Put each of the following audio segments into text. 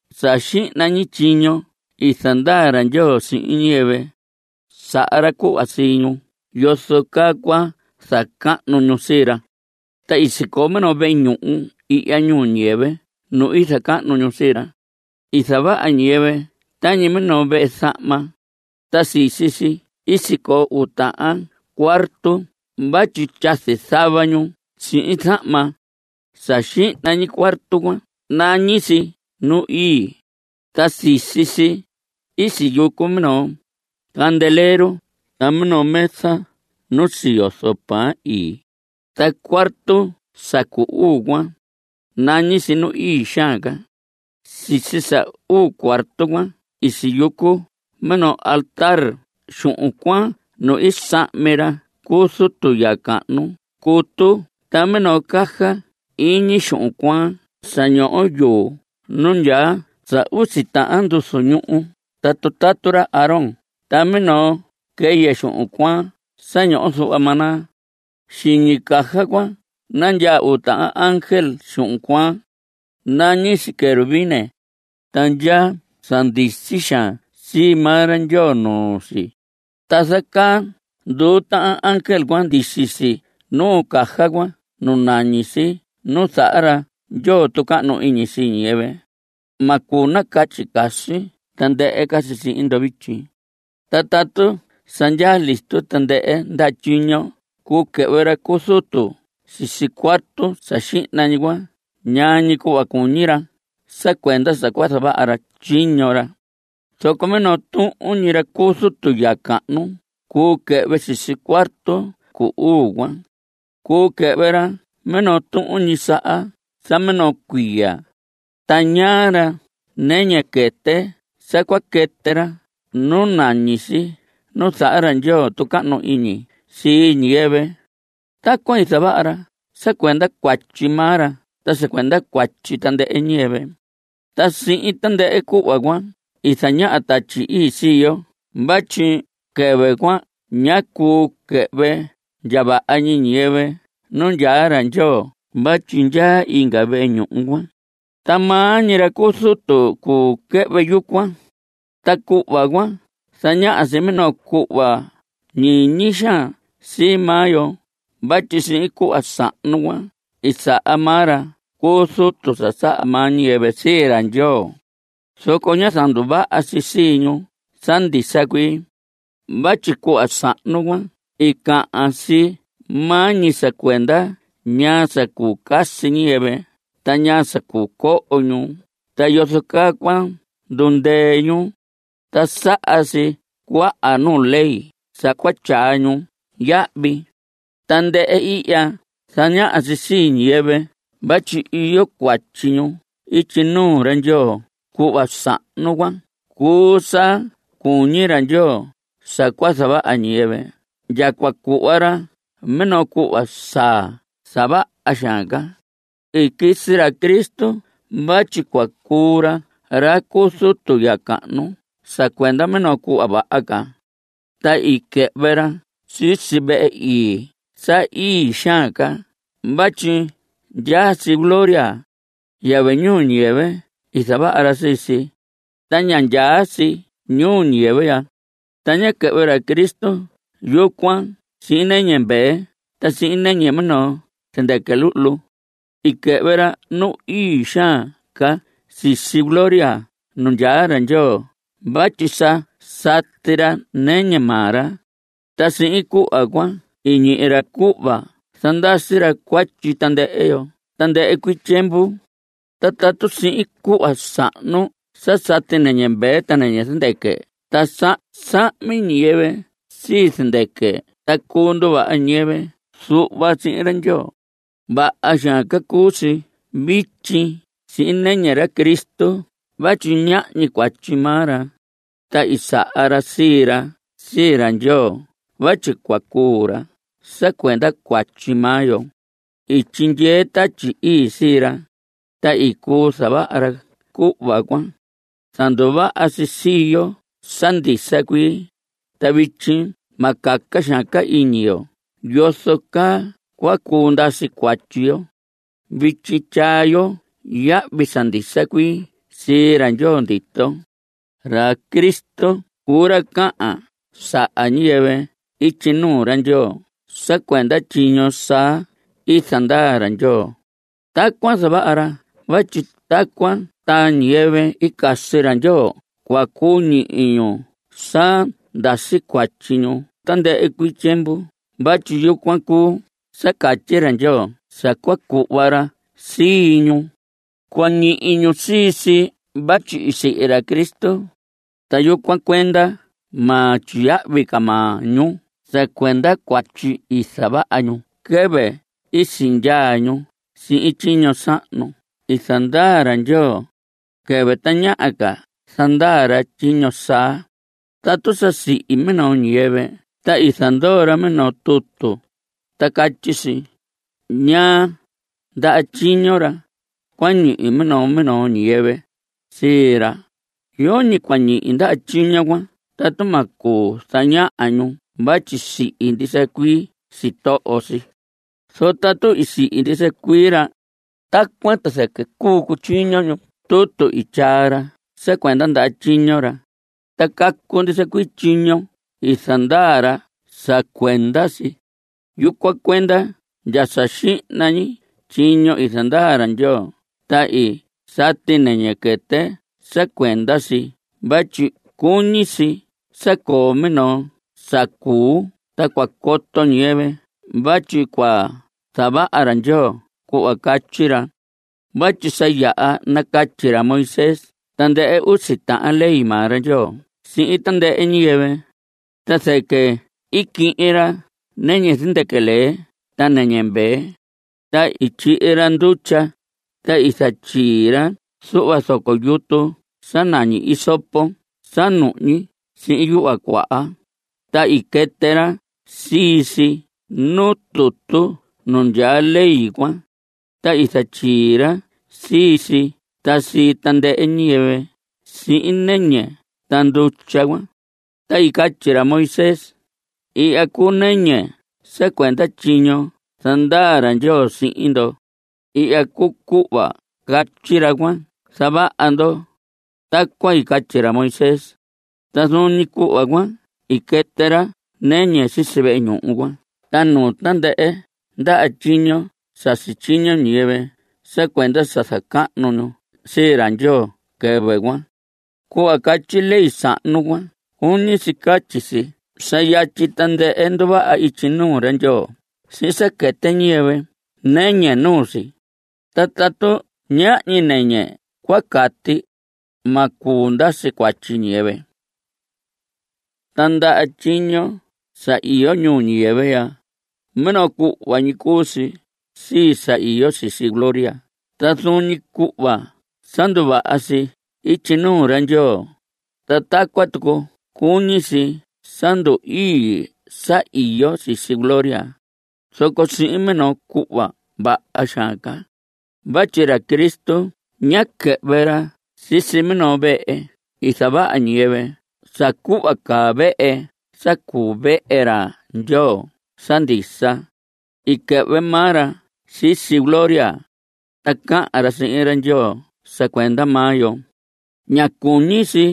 Sa xihna ñi tyiño i zandaa ra Ndyoo sihin ñiyɨvɨ, saha ra cuhva sii ñu yozo caa cua zacahnu ñu sii ra. Ta i sicoo minoo vehe ñuhu ihya ñuu ñiyɨvɨ nu i zacahnu ñu sii ra. I zavaha ñiyɨvɨ tañi minoo vehe zahma. Ta sisi si i sicoo uu tahan cuarto vatyi tyazi zava ñu sihin zahma. Sa xihna ñi cuarto cuan nañi si Nu Ii, ta sisi si i siyucu minoo candelero ta minoo mesa nu siyozo pan ii. Ta cuarto sa cu uu cuan, nañi si Nu Ii Xaan Ca. Sisi sa cu uu cuarto cuan i siyucu minoo altar xuhun cuaan nu i sahmi ra cu zutu ya cahnu cutu ta minoo caja iñi xuhun cuaan sa ñoho yuu nu ndyaa sa usi tahan nduzu ñuhu ta tutatu ra Aarón ta minoo quɨyɨ xuhun cuaan sa ñoho zuhva maná. Xiñi caja cuan nandyaa uu tahan ángel xuhun cuaan. Nañi si querubines. Ta ndyaa sa ndisi xaan sii maa ra Ndyoo nuu si. Ta zacaa nduu tahan ángel cuan ndisi si nuu caja cuan nu nañi si Nu Zaha Ra Ndyoo Tucahnu Iñi Sii Niyɨvɨ. Ma cuu nacatyi casi tandɨhɨ ca si sihin ndo vityi. Ta tatu sa ndyaa listo tandɨhɨ ndaha tyiño cuu quɨhvɨ ra cu zutu sisi cuarto sa xihna ñi cuan ñaa ñi cuhva cuñi ra sa cuenda sa zavaha ra tyiño ra. Zoco minoo tuhun ñi ra cu zutu ya cahnu cuu quɨhvɨ sisi cuarto cu uu cuan. Cuu quɨhvɨ ra minoo tuhun ñi saha sa minoo cuiya. Ta ñaa ra nɨñɨ quɨtɨ sa cua quɨtɨ ra nu nañi si Nu Zaha ra Ndyoo Tucahnu Iñi Sii Ñiyɨvɨ. Tacuan i zavaha ra sa cuenda cuatyi maa ra ta sa cuenda cuatyi tandɨhɨ ñiyɨvɨ. Ta sihin tandɨhɨ cuhva cuan zañaha Tatyi Ii sii yo vatyi quɨvɨ cuan ñá cuu quɨhvɨ ndya vaha ñi ñiyɨvɨ nu ndyaa ra Ndyoo vatyi ndyaa inga vehe ñuhu cuan, ta maa ñi ra cu zutu cuu quɨhvɨ yucuan. Ta cuhva cuan zañaha si minoo cuhva ñiñi xaan sii maa yo vatyi sihin cuhva sahnu cuan i saha maa ra cu zutu sa saha maa ñiyɨvɨ sii ra Ndyoo, zoco ñá zanduvaha si sii ñu sa ndisa cuii. Vatyi cuhva sahnu cuan i cahan si maa ñi sa cuenda ñaa sa cuu casi ñiyɨvɨ ta ñaa sa cuu coho ñu ta yozo caa cua ndundɨɨ ñu, ta saha si cuaha nuu ley sa cua tyaa ñu yahvi. Tandɨhɨ ihya zañaha si sii ñiyɨvɨ vatyi iyo cuatyi ñu ityi nuu ra Ndyoo. Cuhva sahnu cuan cuu sa cuñi ra Ndyoo sa cua zavaha ñiyɨvɨ ndya cua cuhva ra minoo cuhva saa sa vaha xaan ca. I quisi ra Cristo vatyi cua cuu ra ra cu zutu ya cahnu sa cuenda minoo cuhva vaha ca, ta i quɨhvɨ ra sisi vehe ii sa ii xaan ca vatyi ndyaa si gloria. Yɨvɨ ñiyɨvɨ i zavaha sii si, ta ña ndyaa si ñuu ñiyɨvɨ ya. Ta ñá quɨhvɨ ra Cristo yucuan sihin nɨñɨ mvee ta sihin nɨñɨ minoo zɨndɨquɨ luhlu. I quɨhvɨ ra nu ii xaan ca sisi gloria nu ndyaa ra Ndyoo vatyi sa sati ra nɨñɨ maa ra, ta sihin cuhva cuan i ñihi ra cuhva zandasi ra cuatyi tandɨhɨ yo tandɨhɨ cuii tyiemvu. Ta tatu sihin cuhva sahnu sa sati nɨñɨ mvee ta nɨñɨ zɨndɨquɨ ta sa sahmi ñiyɨvɨ sii zɨndɨquɨ ta cuu nduvaha ñiyɨvɨ zuhva sihin ra Ndyoo, vaha xaan ca cuu si vityi sihin nɨñɨ ra Cristo vatyi ñahñi cuatyi maa ra, ta i saha ra sii ra sii ra Ndyoo vatyi cua cuu ra sa cuenda cuatyi maa yo. I tyindyee Tatyi Ii sii ra, ta i cuu zavaha ra cuhva cuan. Zanduvaha si sii yo sa ndisa cuii, ta vityi ma caca xaan ca iñi yo yozo caa cua cuu ndasi cuatyi yo. Vityi tyaa yo yahvi sa ndisa cuii sii ra Ndyoo ndito. Ra Cristo cuu ra cahan saha ñiyɨvɨ ityi nuu ra Ndyoo sa cuenda tyiño saa i zandaa ra Ndyoo. Tacuan zavaha ra vatyi tacuan ta ñiyɨvɨ i casi ra Ndyoo cua cuu ñihi ñu sa ndasi cuatyi ñu tandɨhɨ cuii tyiemvu vatyi yucuan cuu sa catyi ra Ndyoo sa cua cuhva ra sii ñu. Cua ñihi ñu sii si vatyi i sihi ra Cristo, ta yucuan cuenda ma tyiyahvi ca maa ñu sa cuenda cuatyi i zavaha ñu quɨvɨ i sindyaa ñu sihin tyiño sahnu i zandaa ra Ndyoo, quɨvɨ tañaha ca zandaa ra tyiño saa. Tatu sa sihi minoo ñiyɨvɨ ta i zandoo ra minoo tutu ta catyi si ñaa ndaha tyiño ra cua ñihi minoo minoo ñiyɨvɨ sii ra, yoñi cua ñihi ndaha tyiño cuan tatu ma cuu zañaha ñu vatyi i sihi ndisa cuii sitoho si. Zoco tatu i sihi ndisa cuii ra, tacuan ta zɨquɨ cuu cutyiño ñu tutu i tyaa ra sa cuenda ndaha tyiño ra, ta cacu ndisa cuii tyiño i zandaa ra sa cuenda si. Yucuan cuenda ndya sa xihna ñi tyiño i zandaa ra Ndyoo ta i sati nɨñɨ quɨtɨ sa cuenda si vatyi cuñi si sa coo minoo sa cuu ta cua coto ñiyɨvɨ vatyi cua zavaha ra Ndyoo cuhva catyi ra. Vatyi sa yaha nacatyi ra Moisés tandɨhɨ usi tahan ley maa ra Ndyoo sihin tandɨhɨ ñiyɨvɨ, ta zɨquɨ i quihin ra nɨñɨ zɨndɨquɨ lee ta nɨñɨ mvee, ta i tyihi ra ndutya, ta i zatyii ra zuhva zoco yutu sa nañi hisopo sa nuhñi sihin yuhva cuaha, ta i quɨtɨ ra sii si nuu tutu nu ndyaa ley cuan, ta i zatyii ra sii si ta sii tandɨhɨ ñiyɨvɨ sihin nɨñɨ ta ndutya cuan. Ta i catyi ra Moisés: “Ihya cuu nɨñɨ sa cuenda tyiño zandaa ra Ndyoo sihin ndo. Ihya cuu cuhva catyi ra cua zavaha ndo.” Tacuan i catyi ra Moisés. Ta zuun ñi cuhva cuan i quɨtɨ ra nɨñɨ sisi vehe ñuhu cuan ta nuu tandɨhɨ ndaha tyiño sa sityiño ñiyɨvɨ sa cuenda sa zacahnu ñu sii ra Ndyoo quɨvɨ cuan. Cuhva catyi ley sahnu cuan cuñi si catyi si sa sa yatyi tandɨhɨ nduvaha ityi nuu ra Ndyoo sihin sa quɨtɨ ñiyɨvɨ nɨñɨ nuu si. Ta tatu ñahñi nɨñɨ cua cati, ma cuu ndasi cuatyi ñiyɨvɨ. Ta ndaha tyiño sa iyo ñuu ñiyɨvɨ ya, minoo cuhva ñi cuu si sii sa iyo sisi gloria. Ta zuun ñi cuhva sa nduvaha si ityi nuu ra Ndyoo, ta tacuan tucu cuñi si sa ndu‑ii sa iyo sisi gloria, zoco sihin minoo cuhva vaha xaan ca. Vatyi ra Cristo ñá quɨhvɨ ra sisi minoo vehe i zavaha ñiyɨvɨ sa caa cuhva caa vehe sa cuu vehe ra Ndyoo sa ndisa. I quɨhvɨ maa ra sisi gloria, ta cahan ra sihin ra Ndyoo sa cuenda maa yo. Ña cuñi si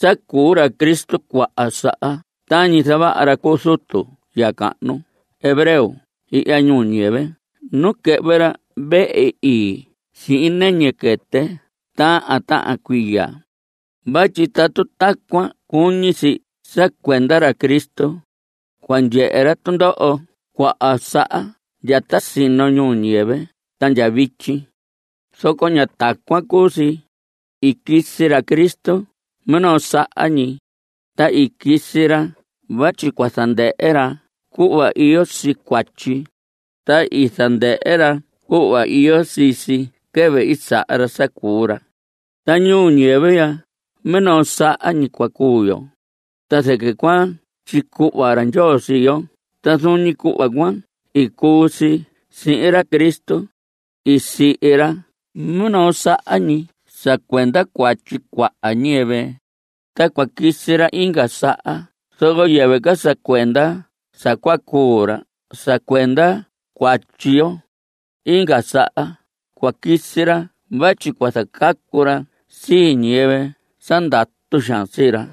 sa cuu ra Cristo cuaha saha tañi zavaha ra cu zutu ya cahnu hebreo ihya ñuu ñiyɨvɨ nu quɨhvɨ ra vehe ii sihin nɨñɨ quɨtɨ tahan tahan cuiya. Vatyi tatu tacuan cuñi si sa cuenda ra Cristo, cua ndyehe ra tundoho cuaha saha ndya ta sino ñuu ñiyɨvɨ ta ndya vityi. Zoco ña tacuan cuu si. I quisi ra Cristo minoo saha ñi, ta i quisi ra vatyi cua zandɨhɨ ra cuhva iyo sii cuatyi. Ta i zandɨhɨ ra cuhva iyo sii si quɨvɨ i saha ra sa cuu ra. Ta ñuu ñiyɨvɨ ya, minoo saha ñi cua cuu yo, ta zɨquɨ cua tyicuhva ra Ndyoo sii yo. Ta zuun ñi cuhva cuan i cuu si sihin ra Cristo. I sihi ra minoo saha ñi sa cuenda cuatyi cuaha ñiyɨvɨ. Ta cua quisi ra inga saha zoco yɨvɨ ca sa cuenda sa cua cuu ra sa cuenda cuatyi yo. Inga saha cua quisi ra vatyi cua zacacu ra sii ñiyɨvɨ sa ndatu xaan sii ra.